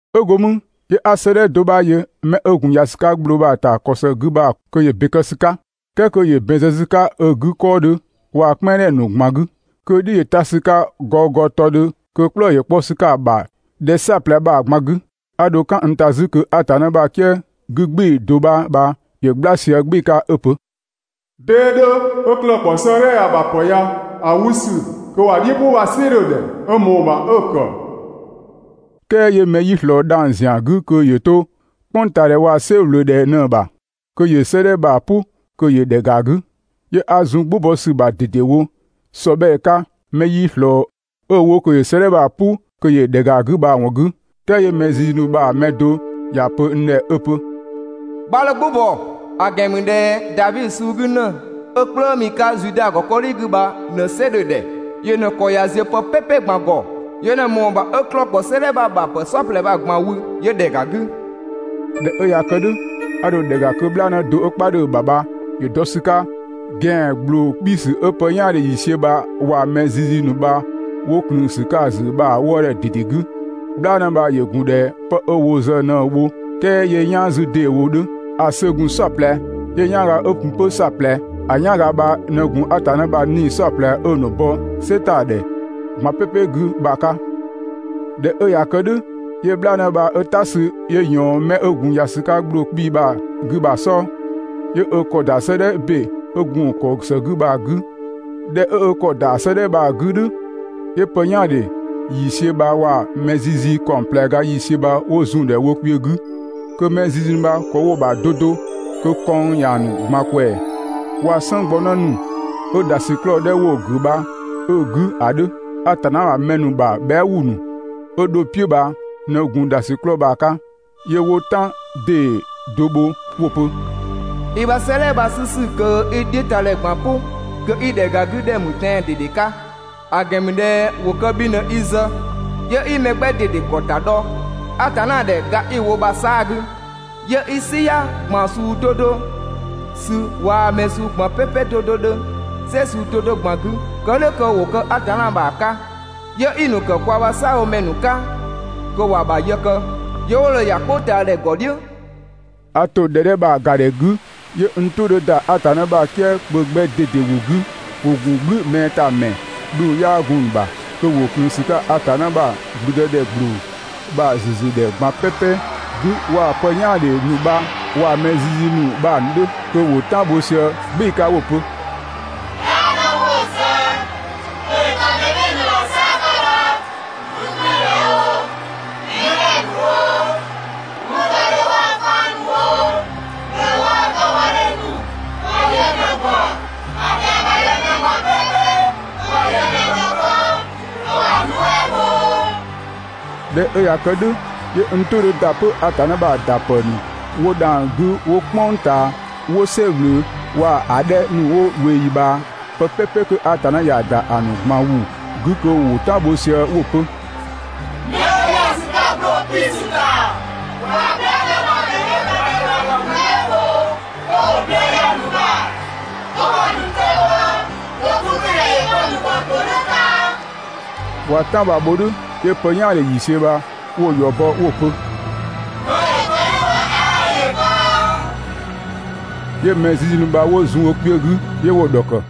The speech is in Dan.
'Ö go mü 'yö 'a 'sëëdhɛ do 'bha yö 'mɛ 'ö gun ‑ya ‑sü 'ka ‑gbloo bha‑ 'gü bha‑ ‑kɔ ‑së 'gü, kö ‑yö ‑be kë ‑sü 'ka, "kɛɛ kö ‑yö ‑bɛn zë ‑sü 'ka ö 'gü 'kɔɔdhɛ waa‑ "kpɛnngdhɛ ‑nu ꞊gban 'gü, kö‑ "dhiʋ̈ ‑yö ta ‑sü 'ka gɔgɔtɔdhö kö 'klëë‑ ‑yö 'kpɔ ‑sü 'ka‑ ‑bha ‑dhɛ "saɔplɛ bha‑ ꞊gban 'gü. 'A dho "kan n ‑ta 'zü kö Atanna ‑bha "kië 'gü "gbɩɩ‑ do 'bha bha ‑yö "gbla sië "gbɩɩ‑ 'ka 'ö‑ pö: «'Dee 'dhö, 'ö 'klëë‑ ‑kpɔ 'sëëdhɛ ya‑ ‑bha ‑pë ya‑ 'wü ‑sü kö ‑wa "dhiʋ̈ "pʋ bha‑ "sɩ 'dhö‑ ‑dhɛ, 'ö ꞊mɔɔ‑ ‑bha 'ö‑ ‑kë.» "Kɛɛ 'yö mɛ 'yii ꞊slɔɔ dhang‑ ‑zian 'gü kö yöö 'to "kpʋngtaadhɛ waa‑ "sɛ ꞊wlöö ꞊dhɛ ꞊në‑ ‑bha, kö ‑yö 'sëëdhɛ bha‑ "pʋ kö ‑yö ‑dhɛ ‑ga 'gü. 'Yö 'a zun "gbʋ bɔ ‑sü ‑bha ꞊dedewo ‑sɔbhɛɛ 'ka mɛ 'yii ꞊slɔɔ 'ö‑ wo kö ‑yö 'sëëdhɛ bha‑ "pʋ kö ‑yö ‑dhɛ ‑ga 'gü bha‑ ‑wɔn 'gü. "Kɛɛ 'yö mɛ zizi ‑nu bha‑ mɛ do ‑ya pö n ‑dhɛ 'ö‑ pö: «'Bha 'dho "gbʋ bɔ, ‑a ‑gɛn ‑mü ꞊dhɛ Davi suu 'gü ‑në 'ö "kplëëmi 'ka Zuda ‑kɔdhi 'gü bha ꞊në "sɩ 'dhö‑ ‑dhɛ, yö ꞊në‑ ‑kɔ ꞊ya ziö pë ꞊gban "pɛpɛ ‑gɔ, yö ꞊në ꞊mɔɔ‑ ‑bha 'ö 'klëë‑ ‑kpɔ 'sëëdhɛ bha‑ ‑bha ‑pë "saɔplɛ bha‑ ꞊gban wü 'yö ‑dhɛ ‑ga 'gü.» ꞊Dhɛ 'ö ꞊ya kë "dhʋ̈, 'a dho ‑dhɛ ‑ga kö "bhlaanë do 'ö "kpaa 'dhö‑ ‑bha ‑yö dɔ ‑sü 'ka ö ‑gɛan ‑gbloo 'kpiisü 'ö pë "yaandhe ‑yiisiö bha waa‑ mɛ zizi ‑nu bha 'wo ꞊klëën ‑sü 'ka‑ ‑zü bha‑ wëëdhɛ ꞊dede 'gü. "Bhlaanë bha ‑yö ‑gun ꞊dhɛ 'pë 'wo kë‑ zë ꞊në‑ bho "kɛɛ 'yö "yaan 'zü ‑deewo 'dhö. ‑A ‑sö ‑gun "saɔplɛ, 'yö‑ "yanga ‑yö gun 'pö "saɔplɛ. ‑A "yanga bha ꞊në gun Atanna ‑bha 'nii‑ "saɔplɛ 'ö‑ ‑nu bɔ "sɛ ‑ta ‑dhɛ ꞊gban "pɛpɛ 'gü bha‑ 'ka. ꞊Dhɛ 'ö ꞊ya kë "dhʋ̈ 'yö "bhlaanë bha 'ö "ta sü 'yö ꞊yɔɔn 'mɛ 'ö gun ‑ya ‑sü 'ka ‑gbloo 'kpii‑ bha‑ 'gü bha‑ "sɔɔ, 'yö ö ‑kɔ ‑da 'sëëdhɛ ‑be 'ö gun‑ ‑kɔ ‑së 'gü bha‑ 'gü. ꞊Dhɛ 'ö ö ‑kɔ ‑da 'sëëdhɛ bha‑ 'gü "dhʋ̈, 'yö pë "yaandhe ‑yiisiö bha waa‑ mɛ zizi ‑kaɔng ꞊plɛ ga ‑yiisiö bha 'wo zun‑ ‑dhɛ wo kpiö 'gü, kö mɛ zizi ‑nu bha ‑kɔ 'wo‑ ‑bha 'do 'do, kö kɔnng ‑ya ‑nu ꞊gban ꞊kwɛɛ‑, waa‑ "sënnggbɔnë ‑nu 'ö ‑dhasiklɔɔ 'dhɛ 'wo‑ ‑gʋ̈ bha 'ö‑ 'gü ‑a 'dhö. Atanna ‑bha mɛ ‑nu ‑bha bhɛa" ‑wʋ ‑nu 'ö dho‑ "piʋ̈ bha ꞊në gun ‑dhasiklɔɔ bha‑ 'ka. 'Yö 'wo "tan ‑dee do bho 'wo‑ pö: «I ‑bha 'sëëdhɛ bha‑ 'sü ‑sü kö 'i‑ "dhiʋ̈tadhɛ ꞊gban "pʋ kö 'i ‑dhɛ ‑ga 'gü ‑dhɛ ‑mü tɛan‑ ꞊dede 'ka. ‑A ‑gɛn ‑mü ꞊dhɛ ‑wo kë bhi ꞊në i zë, 'yö 'i mɛ 'gbɛ ꞊dede ‑gɔ ‑ta dhɔ Atanna ‑dhɛ ga 'i‑ wo bha‑ 'saa‑ 'gü, 'yö 'i "siya ꞊gban suu 'do 'do sü waa‑ mɛ suu ꞊gban "pɛpɛ 'do 'do 'dhö "sɛ suu 'do 'do ꞊gban 'gü kë "dhʋ̈ kö ‑wo kë Atanna ‑bha 'ka. 'Yö 'i‑ ‑nu ‑kë kwa ‑bha "saabhomɛ ‑nu 'ka kö ‑wa ‑bha yë kë, 'yö 'wo dho ‑ya "kpʋngtaadhɛ ‑gɔ "dhiʋ̈.» A ‑to ‑dhɛ 'dhɛ bha‑ ‑ga ‑dhɛ 'gü, 'yö n "tʋ 'dhö ‑da Atanna ‑bha "kië kpö 'gbɛ ꞊dede ‑wʋ 'gü, ‑wo ‑gun "gblü mɛɛ ‑ta ‑mɛɛ, dhʋng 'yaa gun‑ ‑bha, kö ‑wo ꞊klëën ‑sü 'ka Atanna ‑bha ‑blüdëdhɛ ‑gbloo bha‑ ‑züzüdhɛ ꞊gban "pɛpɛ 'gü waa‑ pë "yaandhe ‑nu bha waa‑ mɛ zizi ‑nu bha‑ 'dhö. Kö ‑wo "tan bho sië "gbɩɩ‑ 'ka 'wo‑ pö: «"Bhlaanë 'wo‑ zë kö ‑yö kë mɛ "bhɩɩ‑ ‑nu ‑bha "saa‑ 'ka bha, 'gügbɩɩdhɛ oo, mɛdhɛ ‑nu oo, 'wɔndɔdhe waa‑ faan ‑nu oo, ꞊bhlëë waa‑ 'tɔbhɔdhe ‑nu ‑wa yö ꞊në‑ ‑gɔ. ‑A ‑dhɛa ‑bha ꞊dhɛ mɛ ꞊gban "pɛpɛ ‑wa yö ꞊në‑ ‑dhɔkë, kö ‑wa nuɛ" bho.» ꞊Dhɛ 'ö ꞊ya kë "dhʋ̈, 'yö n "tʋ 'dhö ‑da 'pö Atanna ‑bha ‑da ‑pë ‑nu 'wo dhang‑ 'gü 'wo "kpʋng ꞊taa, 'wo "sɛ ꞊wlöö waa‑ ‑a 'dhɛ ‑nu 'wo ꞊weeyi ꞊bhaa, 'pë "pɛpɛ 'kö Atanna ‑ya ‑da ‑a ‑nu ꞊gban ‑wʋ 'gü kö ‑wo "tan bho sië 'pö 'wo‑ pö: «'Mɛ 'ö ‑ya ‑sü 'ka ‑gbloo 'kpiisü ‑ta waa‑ "bhlaanë bha ꞊në‑ ‑dhɛ 'dhö‑ ‑bha ꞊dhɛ ‑wa ‑nu nuɛ" bho, kö ‑wo ꞊bhlëë ‑ya ‑nu ‑bha, kö ‑wa ‑nu 'tɔ bhɔ, kö 'gügbɩɩdhɛ ‑yö kë‑ ‑nu ‑gɔ ‑todhʋ̈ 'ka.» ꞊Waa‑ "tan bha‑ bho "dhʋ̈, 'yö pë "yaandhe ‑yiisiö bha 'wo‑ ‑yɔ bɔ 'wo‑ pö: «Kö ‑yö kë "dhʋ̈ bha 'aa ‑yö kë.» 'Yö mɛ zizi ‑nu bha 'wo zun wo kpiö 'gü, 'yö 'wo‑ ‑dhɔkë.